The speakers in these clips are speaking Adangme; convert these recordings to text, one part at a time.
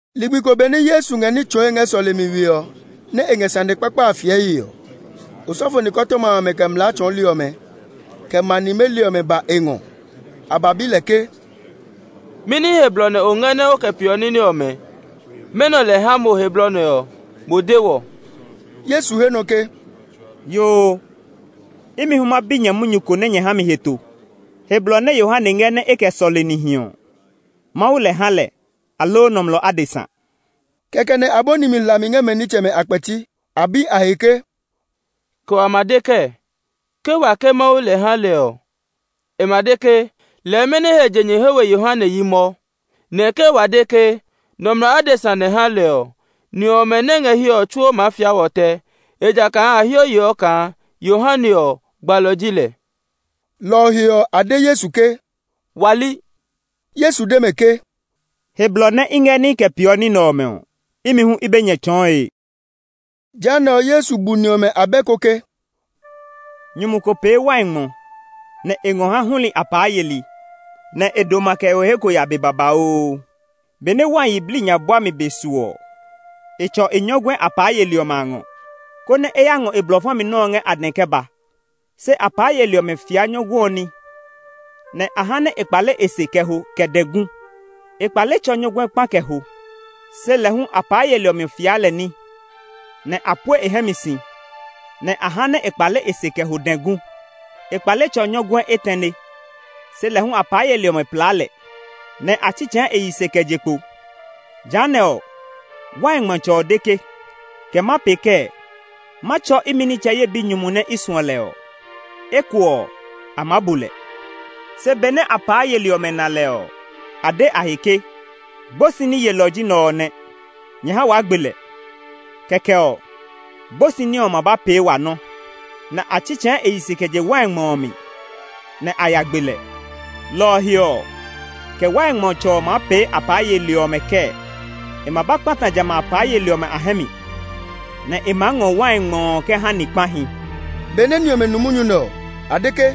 Ligbi ko benɛ Yesu ngɛ ní tsɔɔe ngɛ sɔlemi we ɔ, nɛ e ngɛ sane kpakpa a fiɛe ɔ, osɔfo nikɔtɔma amɛ, kɛ mlaa tsɔɔli ɔmɛ, kɛ ma nimeli ɔmɛ ba e ngɔ. A ba bi lɛ ke, “Mɛni he blɔ nɛ o ngɛ nɛ o kɛ peeɔ ní nɛ ɔmɛ? Mɛnɔ lɛ ha mo he blɔ nɛ ɔ? Mo de wɔ!” Yesu he nɔ ke, “Yoo, imi hu ma bi nyɛ munyu ko nɛ nyɛ ha mi heto. He blɔ nɛ Yohane ngɛ nɛ e kɛ sɔle nihi ɔ, Mawu lɛ ha lɛ, aloo nɔmlɔ adesa?” Kɛkɛ nɛ a bɔni mi hlami ngɛ mɛ nitsɛmɛ a kpɛti. A bi a he ke, “Kɛ wa ma de kɛɛ? Ke wa ke, Mawu nɛ ha lɛ ɔ, e ma de ke, ‘Lɛɛ mɛni he je nyɛ he we Yohane yi mɔ?’ Nɛ ke wa de ke, ‘Nɔmlɔ adesa nɛ ha lɛ’ ɔ, ni ɔmɛ nɛ ngɛ hiɛ ɔ tsuo maa fia wɔ tɛ; ejakaa a heɔ yeɔ kaa Yohane ɔ, gbalɔ ji lɛ.” Lɔ ɔ he ɔ, a de Yesu ke, “Wa li.” Yesu de mɛ ke, “He blɔ nɛ i ngɛ nɛ i kɛ peeɔ ní nɛ ɔmɛ ɔ, imi hu i be nyɛ tsɔɔe!” Jehanɛ ɔ, Yesu bu ni ɔmɛ abɛ ko ke, “Nyumu ko pee wai ngmɔ, nɛ e ngɔ ha huli apaa yeli, nɛ e doma kɛ ho he ko ya be babauu. Benɛ wai yiblii nya buami be su ɔ, e tsɔ e nyɔguɛ apaa yeli ɔmɛ a ngɔ, konɛ e ya ngɔ e blɔ fa mi nɔ́ ɔ ngɛ a dɛ kɛ ba. Se apaa yeli ɔmɛ fia nyɔguɛ ɔ ní, nɛ a ha nɛ e kpale e se kɛ ho dɛ gu. E kpale tsɔ nyɔguɛ kpa kɛ ho. Se lɛ hu apaa yeli ɔmɛ fia lɛ ní, nɛ a pue e hɛ mi si, nɛ a ha nɛ e kpale e se kɛ ho dɛ gu. E kpale tsɔ nyɔguɛ etɛne; se lɛ hu apaa yeli ɔmɛ plaa lɛ, nɛ a tsitsɛɛ e yi se kɛ je kpo. Jehanɛ ɔ, wai ngmɔtsɛ ɔ de ke, ‘Kɛ ma pee kɛɛ? Ma tsɔ imi nitsɛ ye binyumu nɛ i suɔ lɛ ɔ; eko ɔ, a maa bu lɛ!’ Se benɛ apaa yeli ɔmɛ na lɛ ɔ, a de a he ke, ‘Gbosi ní yelɔ ɔ ji nɛ ɔ nɛ. Nyɛ ha waa gbe lɛ! Kɛkɛ ɔ, gbosi ní ɔ ma ba pee wa nɔ́.’ Nɛ a tsitsɛɛ e yi se kɛ je wai ngmɔ ɔ mi, nɛ a ya gbe lɛ. “Lɔ ɔ he ɔ, kɛ wai ngmɔtsɛ ɔ maa pee apaa yeli ɔmɛ kɛɛ? E ma ba kpata jamɛ a apaa yeli ɔmɛ a hɛ mi, nɛ e maa ngɔ wai ngmɔ ɔ kɛ ha ni kpahi.” Benɛ ni ɔmɛ nu munyu nɛ ɔ, a de ke,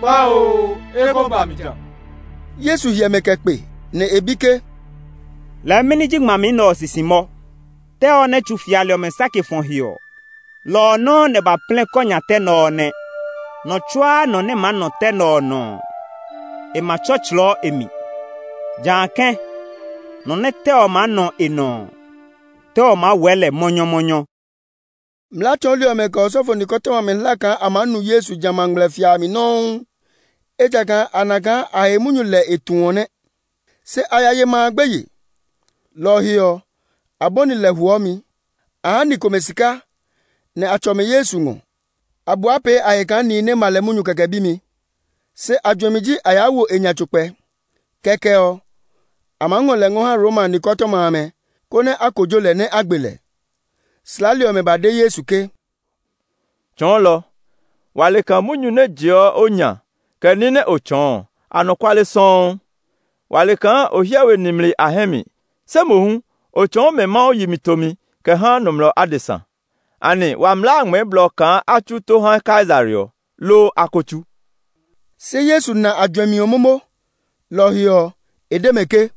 “Kpaoo, e ko ba mi ja!” Yesu hyɛ mɛ kɛ kpe, nɛ e bi ke, “Lɛɛ mɛni ji ngmami nɛ ɔ sisi mɔ? ‘Tɛ ɔ nɛ tsu fiali ɔmɛ sake fɔ he ɔ, lɔ ɔ nɔuu nɛ ba plɛ kɔ nya tɛ nɛ ɔ nɛ.’ Nɔ tsuaa nɔ nɛ maa nɔ tɛ nɛ ɔ nɔ ɔ, e ma tsɔtslɔɔ e mi; jã kɛ̃, nɔ nɛ tɛ ɔ maa nɔ e nɔ ɔ, tɛ ɔ maa wɛɛ lɛ mɔnyɔmɔnyɔ.” Mlaa tsɔɔli ɔmɛ, kɛ osɔfo nikɔtɔma amɛ hla kaa a maa nu Yesu jamɛ a ngmlɛfia a mi nɔuu; ejakaa a na kaa a he munyu lɛ e tu ɔ nɛ. Se a ya ye ma a gbeye. Lɔ ɔ he ɔ, a bɔni lɛ huɔmi. A ha ni komɛ sika, nɛ a tsɔ mɛ Yesu ngɔ. A bua pee a he kaa nihi nɛ ma lɛ munyu kɛkɛ bimi; se a juɛmi ji a yaa wo e nya tso kpɛ. Kɛkɛ ɔ, a maa ngɔ lɛ ngɔ ha Roma nikɔtɔma amɛ, konɛ a kojo lɛ, nɛ a gbe lɛ. Slaali ɔmɛ ba de Yesu ke, “Tsɔɔlɔ, wa le kaa munyu nɛ jeɔ o nya, kɛ ní nɛ o tsɔɔ ɔ, anɔkuale sɔuu. Wa le kaa o hyɛ we nimli a hɛ mi, se mohu o tsɔɔ mɛ Mawu yi mi tomi kɛ ha nɔmlɔ adesa. Anɛ wa mlaa a ngmɛɛ blɔ kaa a tsu tó ha Kaisare ɔ, loo a ko tsu?” Se Yesu na a juɛmi ɔ momo. Lɔ ɔ he ɔ, e de mɛ ke,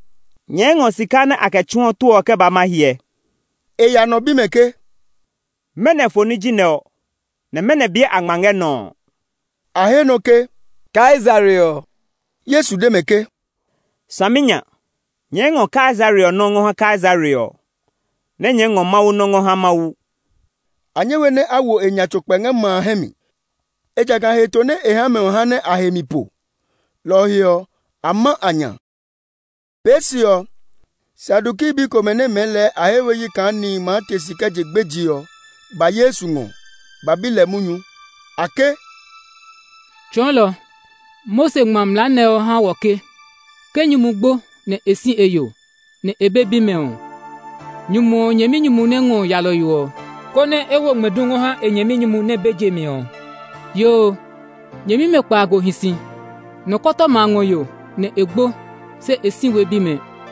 “Nyɛɛ ngɔ sika nɛ a kɛ tsuɔ tó ɔ kɛ ba nɛ ma hyɛ!” E ya nɔ bi mɛ ke, “Mɛnɔ foni ji nɛ ɔ, nɛ mɛnɔ biɛ a ngma ngɛ nɔ ɔ?” A he nɔ ke, “Kaisare ɔ.” Yesu de mɛ ke, “Saminya! Nyɛɛ ngɔ Kaisare ɔ nɔ́ ngɔ ha Kaisare ɔ, nɛ nyɛɛ ngɔ Mawu nɔ́ ngɔ ha Mawu!” A nyɛ we nɛ a wo e nya tso kpɛ ngɛ ma a hɛ mi, ejakaa heto nɛ e ha mɛ ɔ ha nɛ a he mi po. Lɔ ɔ he ɔ, a ma a nya. Pee se ɔ, Saduki bi komɛ nɛ mɛɛ lɛɛ a he we yi kaa nihi maa te si kɛ je gbeje ɔ, ba Yesu ngɔ ba bi lɛ munyu. A ke, “Tsɔɔlɔ, Mose ngma mlaa nɛ ɔ ha wɔ ke, ‘Ke nyumu gbo, nɛ e si e yo, se e be bimɛ ɔ, nyumu ɔ nyɛminyumu nɛ ngɔ yalɔyo ɔ, konɛ e wo ngmɛdu ngɔ ha e nyɛminyumu nɛ be je mi ɔ.’ Yoo, nyɛmimɛ kpaago hi si. Tɛte ɔ ngɔ yo, nɛ e gbo, se e si we bimɛ.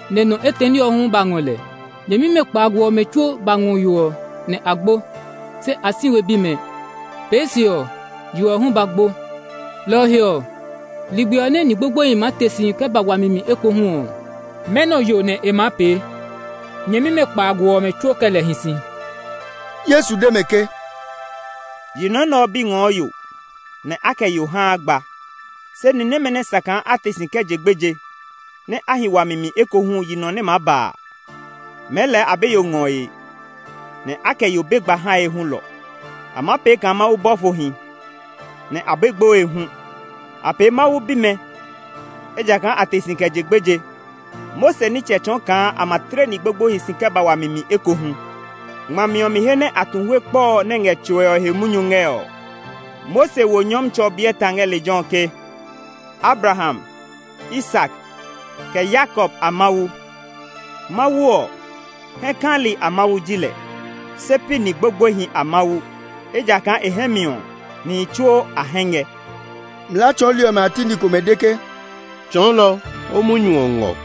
nɛ Tɛɛ ɔ hu ba ngɔ lɛ. Nyɛmimɛ kpaago ɔmɛ tsuo ba ngɔ yo ɔ, nɛ a gbo; se a si we bimɛ. Pee se ɔ, yo ɔ hu ba gbo. Lɔ ɔ he ɔ, ligbi ɔ nɛ ni gbogboehi maa te si kɛ ba wami mi ekohu ɔ, mɛnɔ yo nɛ e maa pee? Nyɛmimɛ kpaago ɔmɛ tsuo kɛ lɛ hi si.” Yesu de mɛ ke, “Yi nɔ nɛ ɔ bi ngɔɔ yo, nɛ a kɛ yo haa gba. Se ni nɛmɛ nɛ sa kaa a te si kɛ je gbeje, nɛ a hi wami mi ekohu yi nɔ nɛ maa ba a, mɛɛ lɛɛ a be yo ngɔe, nɛ a kɛ yo be gba hae hulɔ. A maa pee kaa Mawu bɔfohi, nɛ a be gboe hu. A pee Mawu bimɛ, ejakaa a te si kɛ je gbeje. Mose nitsɛ tsɔɔ kaa a ma tle ni gbogboehi si kɛ ba wami mi ekohu. Ngmami ɔ mi he nɛ a tu hue kpɔ ɔ nɛ ngɛ tsoe ɔ he munyu ngɛ ɔ, Mose wo Nyɔmtsɛ ɔ biɛ ta ngɛ lejɛ ɔ ke, ‘Abraham, Isak, kɛ Yakob a Mawu.’ Mawu ɔ, hɛ kali a Mawu ji lɛ, se pi ni gbogboehi a Mawu; ejakaa e hɛ mi ɔ, nihi tsuo a hɛ ngɛ.” Mlaa tsɔɔli ɔmɛ a ti ni komɛ de ke, “Tsɔɔlɔ, o munyu ɔ ngɔ!”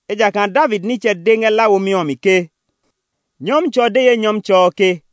Ejakaa David nitsɛ de ngɛ La Womi ɔ mi ke, ‘Nyɔmtsɛ ɔ de ye Nyɔmtsɛ ɔ ke,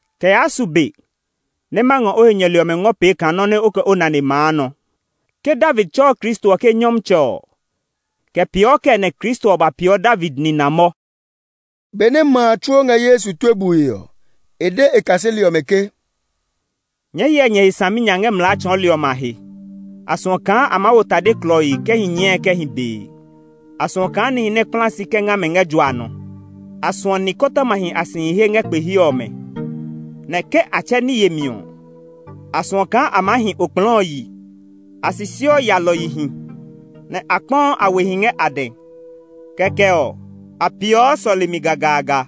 kɛ yaa su be nɛ ma ngɔ o he nyɛli ɔmɛ ngɔ pee kaa nɔ́ nɛ o kɛ o nane maa nɔ.’ Ke David tsɛɔ Kristo ɔ ke, ‘Nyɔmtsɛ’ ɔ, kɛ peeɔ kɛɛ nɛ Kristo ɔ ba peeɔ David nina mɔ?” Benɛ ma a tsuo ngɛ Yesu tue bue ɔ, e de e kaseli ɔmɛ ke, “Nyɛɛ hyɛ nyɛ he saminya ngɛ mlaa tsɔɔli ɔmɛ a he. A suɔ kaa a maa wo tade klɔii kɛ hi nyɛɛe kɛ hi bee. A suɔ kaa nihi nɛ kpla si kɛ nga mɛ ngɛ jua nɔ. A suɔ nikɔtɔmahi a sihi he ngɛ kpe he ɔmɛ; nɛ ke a tsɛ ní yemi ɔ, a suɔ kaa a maa hi okplɔɔ ɔ yi. A sisiɔ yalɔyihi, nɛ a kpɔɔ a wehi ngɛ a dɛ. Kɛkɛ ɔ, a peeɔ sɔlemi gagaaga,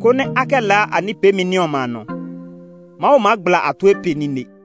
konɛ a kɛ laa a ní peemi ní ɔmɛ a nɔ. Mawu maa gbla a tue pe nine!”